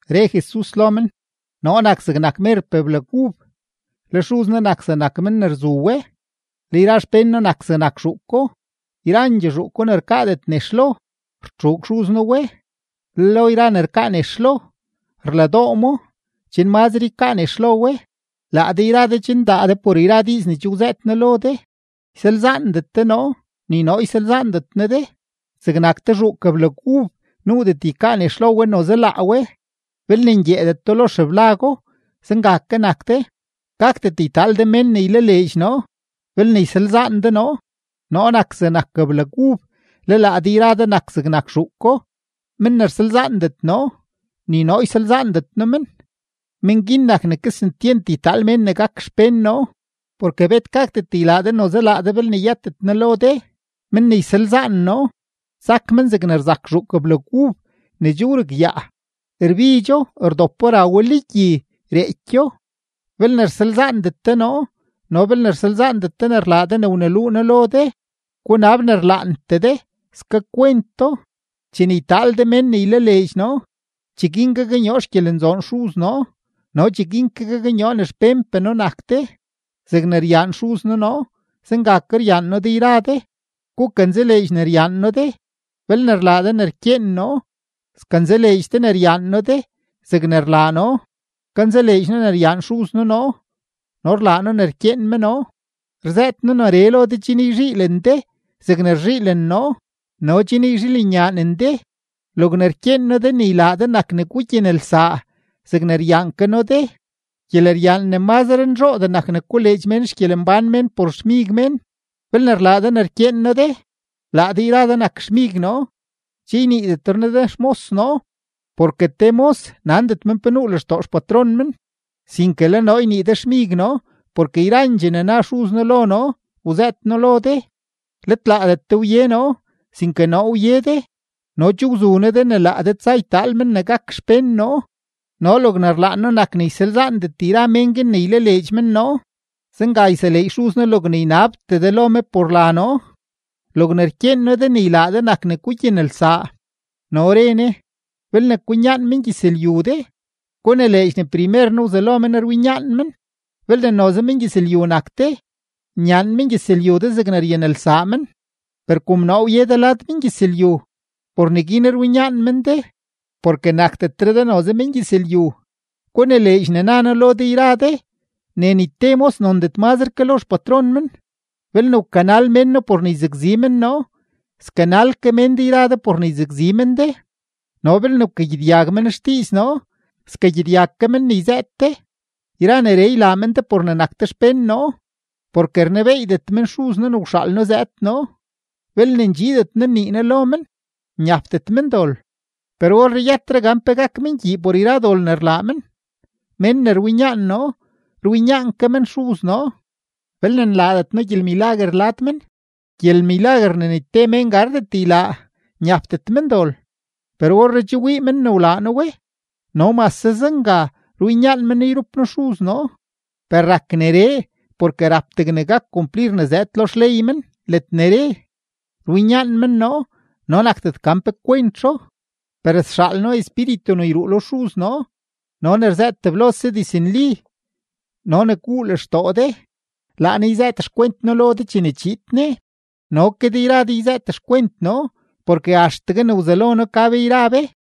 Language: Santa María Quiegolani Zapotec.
Re Jesus lo men: ―Noo nak zegnak merpee blag ub, le Xuz noo nak zegnak men ne rzu we, le yra xpén noo nak zegnak zhuuko. Yrandxee zhuuko ne rkaadet nex lo, rtxuug Xuz noo we; le lo yra ne rkaa nex lo, rladoo mo chen mazre ykaa nex lo we. Laa de yra de che ndaa de por yra diiz ne che wzëët noo lo de. Ysalzaandet de noo, ni noo ysalzaandet noo de. Zegnak te zhuuk blag ub nuudet ykaa nex lo we noze laa we belne ngyeedeto lo xeblago, zenga ke nak de, gakdet ytaal de mén ne ylaleedx noo belne ysalzaan de noo. ’Noo nak zegnak blag ub, le laa de yra de nak zegnak zhuuko. Men ne rsalzaandet noo, ni noo ysalzaandet noo men, men guin nak ne kesentyent ytaal mén ne gak xpén noo; porke bet gakdet ylaa de noze laa de belne yëtet noo lo de. Men ne ysalzaan noo, sak men zegne rzak zhuuk blag ub ne che wrugyaa, rbidxo; rdopo, ra we lo gyi, reekyo. ’Belne rsalzaandet de noo no belne rsalzaandet ne rlaa de ne wneluu noo de, gunab ne rlaantee de, skakwent do. Chene ytaal de mén ne ylaleedx noo, cheguin gaknyoo xgyelenzoon Xuz noo no cheguin ke gaknyoo ne xpénpee noo nak de. Zegne ryaan Xuz noo noo, zenga ke ryaan noo de yra de; gukanzaleedx ne ryaan noo de. Belne rlaa de ne rkyeen noo, skanzaleedx de ne ryaan noo de, zegne rlaa noo, kanzaleedx noo ne ryaan Xuz noo noo, no rlaa noo ne rkyeen me noo. ’Rzëët noo neree lo de chen yzhiilen de zegne rzhiilen noo no chen yzhiilenyaanen de. Logne rkyeen noo de ne ylaa de nak ne gugyanelsaa zegne ryaan ke noo de. Gyeleryaan ne mazre nzhoodee nak ne koleedx xgyelembán mén por xmig mén. Belne rlaa de ne rkyeen noo de, laa de yra de nak xmig noo. Che yniidetre noo de xmos noo porke te mos nandet men pe nuu lextoo xpatron men, sinke le noo ynii de xmig noo porke yrandxee ne na Xuz noo lo noo wzëët noo lo de. Let laadet de wye noo, sinke noo wye de no che wzu noo de ne laa de tsa ytaal mén ne gak xpén noo no logne rlaan noo nak ne ysalzaandet yra mén guin ne ylaleedx men noo. Zenga yseleedx Xuz noo logne ynabtee de lo me por la noo. Logne rkyeen noo de ne ylaa de nak ne gugyanelsaa. No re Jesus: ―Belne kwinyaan mengyëzlyu de, gunileedx ne primer noo wzelo men rwinyaan men. Belne noze mengyëzlyu nak de, nyaan mengyëzlyu de zegne ryanelsaa men. Per kom noo wye de lad mengyëzlyu, por neguin rwinyaan men de, porke nakdetre de noze mengyëzlyu. Gunileedx ne na noo lo de yra de ne ni te mos nondet mazre ke lo xpatron men. Belne wkanal mén noo por ne yzakzi men noo, skanal ke mén de yra de por ne yzakzi men de, no belne wkagyedyag men xdiiz noo, skagyedyag ke men ne yzëët de. Yra neree ylaa men de por ne nak de xpén noo, porke rnebeeydet men Xuz noo ne wxaal noo zëëd noo. ’Belne ndxiidet noo nnii noo lo men, nyapdet men dol. Per orree yëtre gan pe gak men gyii por yra dol ne rlaa men. Mén ne rwinyaan noo, rwinyaan ke men Xuz noo. Belne nlaadet noo gyelmilaguer lad men, gyelmilaguer ne ni te mén gardet ylaa, nyapdet men dol; per orree che wii men wlaa noo we no mase zenga rwinyaan men noo yrup noo Xuz noo. Per rak neree porke rap degne gak kumplir ne zëëd lo xley men ledne re: “Rwinyaan men noo no nakdet gan pe kwentzho.” ’Per sxaal noo Espíritu ne yruu lo Xuz noo no ne rzëët teblose diznli no ne guu lextoo de; laa Ne yzëët xkwent noo lo de chene chiid Ne. No ke de yra de yzëët xkwent noo porke axtegue ne wzelo noo, ka be yra be.